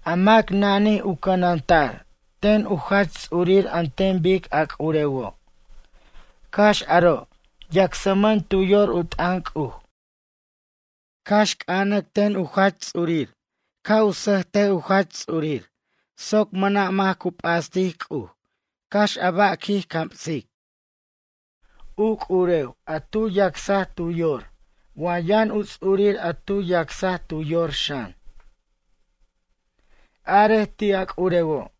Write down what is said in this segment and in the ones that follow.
A mac nanij u c'ananta'r ten u jach ts'ur an ten bic a c'urewo'. Cax aro' yacsmʌn tu yor u t'ʌn C'uj. Cax c'ʌnac ten u jach ts'urir ca' u sʌjt u jach ts'urir soc mʌna' mac cu p'astic C'uj cax a ba' quij camsic. U c'urew a tu yacsaj tu yor wa yʌn u ts'urir a tu yacsaj tu yor xan. Arej ti' a c'urewo'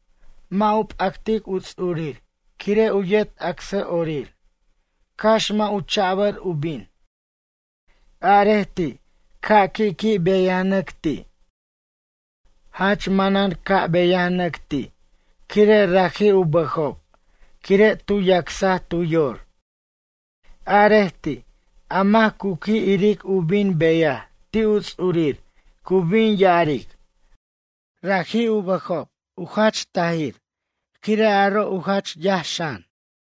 mʌ' u p'actic u ts'urir quire' u yet acsʌ'orir, cax mʌ' u cha'bʌr u bin. Arej ti' ca' qui' qui' beyanʌqui' ti'. Jach manan caj u beyanʌc ti' quire' raji' u bʌjob quire' tu yacsaj tu yor. Arej ti', a mac cu qui' iric u bin beyaj ti' u ts'urir cu bin ya'aric: ―Raji' u bʌjob jach tajir quire' aro' u jach yaj xan.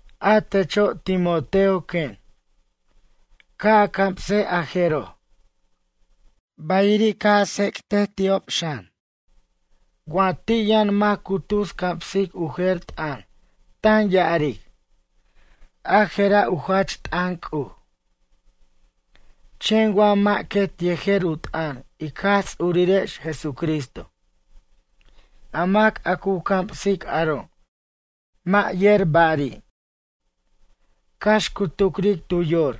A techo' Timoteo quen. Ca' a camsej a jeroj. Bayiri' ca' a tsec't ti'ob xan. Wa ti' yʌn mac cu tus camsic u jer t'ʌn tan ya'aric: ―A je'ra' u jach t'ʌn C'uj. Chen wa mʌ' quet yejer u t'ʌn ic Jaj Ts'urirex Jesucristo. A mac a cu camsic aro' mʌ' yer ba'ri'. Cax cu tucric tu yor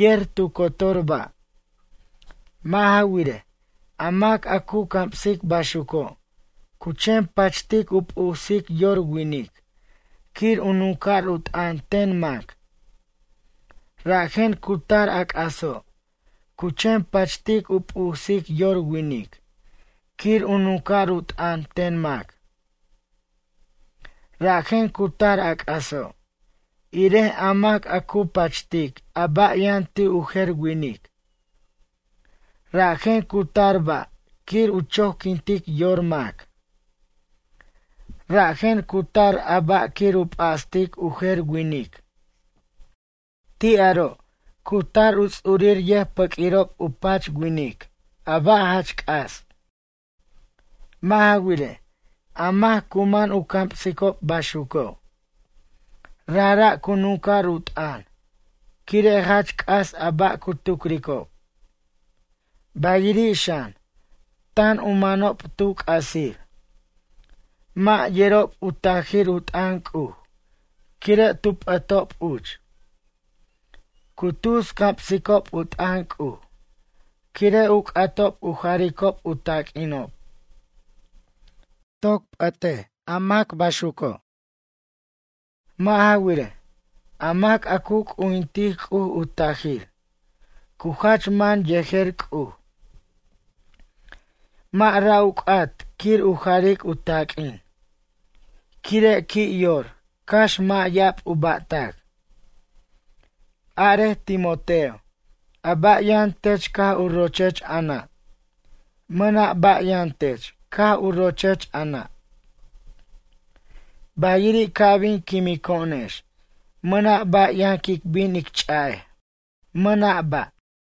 yer tu cotor ba'. Mʌ' ja wirej, a mac a cu camsic baxuco' cu chen pachtic u p'usic yor winic quir u nunca'r u t'ʌn ten mac. Rajen cu tar a c'aso', cu chen pachtic u p'usic yor winic quir u nunca'r u t'ʌn ten mac. Rajen cu tar a c'aso', irej a mac a cu pachtic a ba' yʌn ti' u jer winic. Rajen cu tar ba' quir u choquintic yor mac. Rajen cu tar a ba' quir u p'astic u jer winic. Ti' aro' cu tar u ts'urir yʌjpaq'uirob u pach winic a ba' jach c'as. Mʌ' ja wirej, a mac cu man u camsicob baxuco'. Rajra' cu nunca'r u t'ʌn quire' jach c'as a ba' cu tucricob. Bayiri' xan, tan u manob tu c'asir. Mʌ' yerob u tajir u t'ʌn C'uj quire' tu p'ʌtob uch. Cu tus camsicob u t'ʌn C'uj, quire' u c'atob u jaricob u taq'uinob. Toc p'ʌt mac baxuco'. Mʌ' ja wirej, a mac a cu c'ujintic C'uj u tajir, cu jach man yejer C'uj. Mʌ' ra' u c'at quir u jaric u taq'uin. Quire' qui' yor cax mʌ' ya'ab u ba'tac. Arej Timoteo a ba' yʌn tech caj u rochech a nʌ'? Mʌna' ba' yʌn tech caj u rochech a nʌ'. Bayiri' ca' bin quimco'onex, mʌna' ba' yʌn quic bin ic ch'a'ej. Mʌna' ba'.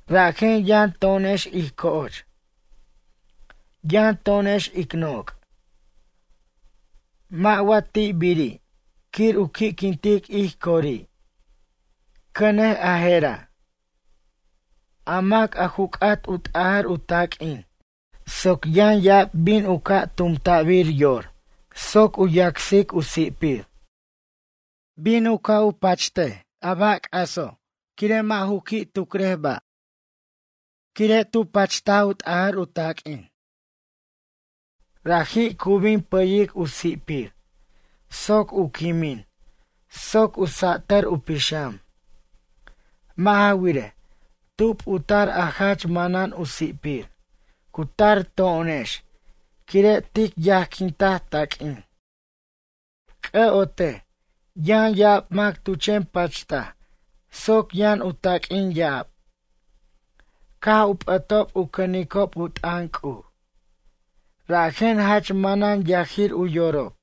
Rajen yʌn to'onex ij co'och. Yʌn to'onex ic noc'. Mʌ' wa ti'ibiri' quir u qui'quintic ij cori'? Cʌnej a je'ra'. A mac a ju c'at u t'ajʌr u taq'uin soc yʌn ya'ab bin u ca' tumta'bir yor soc u yacsic u si'pir. Bin u ca' u pacht a ba' c'aso' quire' mʌ' ju qui' tucrej ba'. Quire' tu pacht u t'ajʌr u taq'uin. Raji' cu bin pʌyic u si'pir soc u quimin soc u sa'tʌr u pixam. Mʌ' ja wirej, tub u tar a jach manan u si'pir? Cu tar to'onex quire' tic yajquintaj taq'uin. C'ʌ'otej, yʌn ya'ab mac tu chen pachtaj soc yʌn u taq'uin ya'ab. Caj u p'ʌtob u cʌnicob u t'ʌn C'uj. Rajen jach manan yajir u yorob.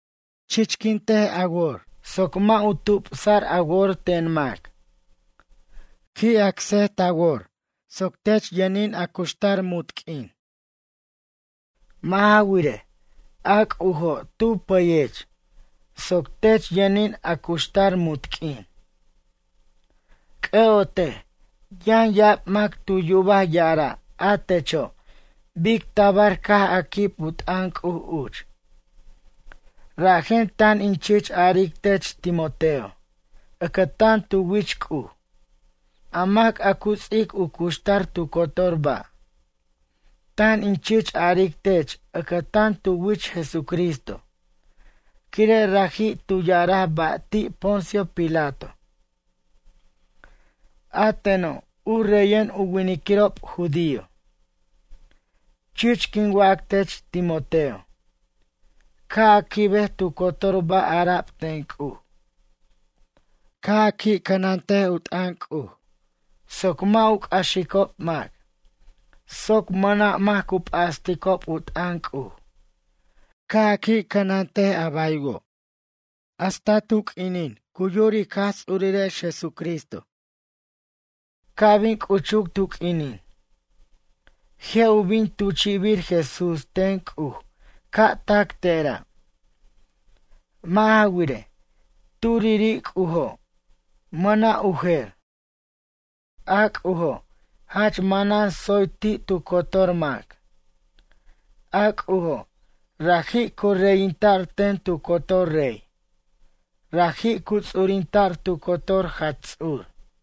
Chichquint a wor soc mʌ' u tupsa'r a wor ten mac. Qui' acsej ta wor soc tech yʌnin a cuxtar munt q'uin. Mʌ' ja wirej, a C'ujo' tu pʌyech soc tech yʌnin a cuxtar munt q'uin. C'ʌ'otej yʌn ya'ab mac tu yubaj ya'ara' a techo' bic tabar caj a quib u t'ʌn C'uj uch. Rajen tan in chich aric tech Timoteo ʌcʌtan tu wich C'uj a mac a cu ts'ic u cuxtar tu cotor ba'. Tan in chich aric tech ʌcʌtan tu wich Jesucristo quire' raji' tu ya'araj ba' ti' Poncio Pilato: ―A teno' u reyen u winiquirob judío. Chich quin wac tech, Timoteo, ca' a quibej tu cotor ba' ara'b ten C'uj. Ca' a qui' cʌnant u t'ʌn C'uj soc mʌ' u c'axico' mac, soc mʌna' mac cu p'asticob u t'ʌn C'uj. Ca' a qui' cʌnant a baywo', hasta tu q'uinin cu yur ic Jaj Ts'urirex Jesucristo. Ca' bin c'uchuc tu q'uinin. Je' u bin tuchi'bir Jesús ten C'uj ca' tac tera'. Mʌ' ja wirej, turiri' C'ujo', mʌna' u jer. A C'ujo' jach manan tsoy ti' tu cotor mac. A C'ujo' raji' cu reyinta'r ten tu cotor rey. Raji' cu ts'urinta'r tu cotor jach ts'ur.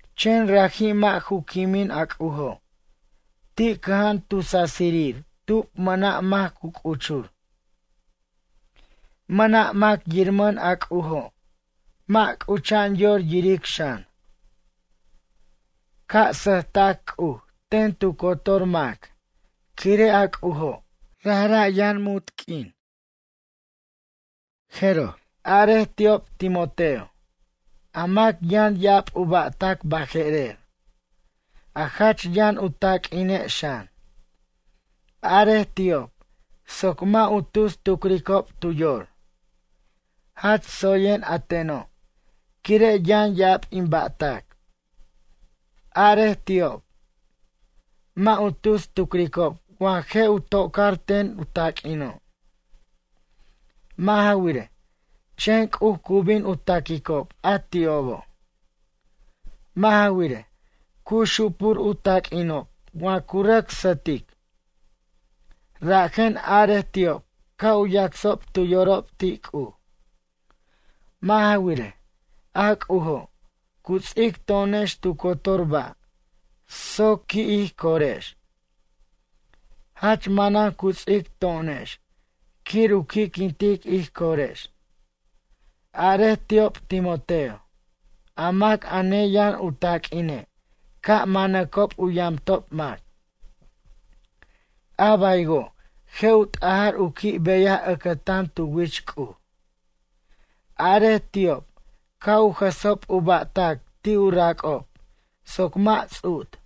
Chen raji' mʌ' ju quimin a C'ujo', ti' cʌja'an tu sasir tub mʌna' mac cu c'uchur. Mʌna' mac yirmʌn a C'ujo' mʌ' c'ucha'an yor yiric xan. Ca' sʌjta'c C'uj ten tu cotor mac quire' a C'ujo' rajra' yʌn muntq'uin. Jeroj. Arej ti'ob Timoteo. A mac yʌn ya'ab u ba'tac baje'rer, a jach yʌn u taq'uine' xan. Arej ti'ob soc mʌ' u tus tucricob tu yor: ―Jach tsoyen a teno', quire' yʌn ya'ab in ba'tac. Arej ti'ob. Mʌ' u tus tucricob wa je' u to'car ten u taq'uino'. Mʌ' ja wirej, chen C'uj cu bin ta'quicob a ti'obo'. Mʌ' ja wirej, cu xupur u taq'uinob wa cu rʌc sʌtic. Rajen arej ti'ob ca' u yacsob tu yorob ti' C'uj. Mʌ' ja wirej, a C'ujo', cu ts'ic to'onex tu cotor ba' soc qui' ij corex. Jach manan cu ts'ic to'onex quir u qui'quintic ij corex. Arej ti'ob Timoteo. A mac a neyʌn u taq'uine' ca' manacob u yamtob mac. A baywo' je' u t'ajar u qui' beyaj ʌcʌtan tu wich C'uj. Arej ti'ob ca' u jʌsob u ba'tac ti' u rac'ob soc mʌ' ts'ut.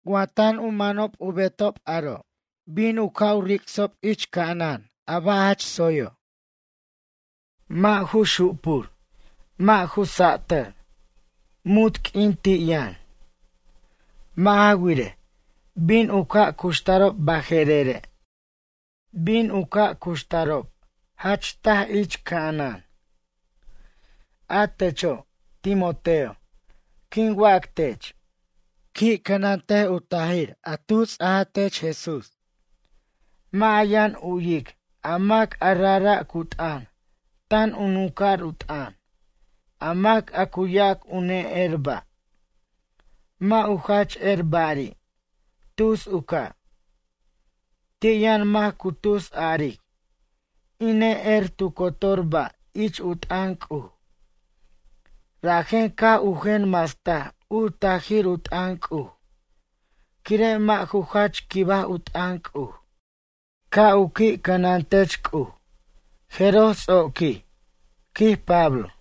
Wa tan u manob u betob aro' bin u ca' ric'sob ich ca'anan a ba' jach tsoyo'. Mʌ' ju xupur mʌ' ju satar. Munt q'uin ti' yʌn. Mʌ' ja wirej, bin u ca' cuxtarob baje'rere'. Bin u cu ca' cuxtarob jach taj ich ca'anan. A techo', Timoteo, quin wac tech. Qui' cʌnant u tajir a tu ts'a tech Jesús. Mʌ' a yʌn u'yic a mac a rajra' cu t'ʌn tan u nunca'r u t'ʌn, a mac a cu yac u ne'er ba'. Mʌ' u jach er ba'ri'. Tus u ca'. Ti' yʌn mac cu tus aric: in ne'er tu cotor ba' ich u t'ʌn C'uj. Rajen caj u jen mastaj u tajir u t'ʌn C'uj quire' mʌ' ju jach quibaj u t'ʌn C'uj. Ca' u qui' cʌnan tech C'uj Jeroj ts'oquij, quij Pablo.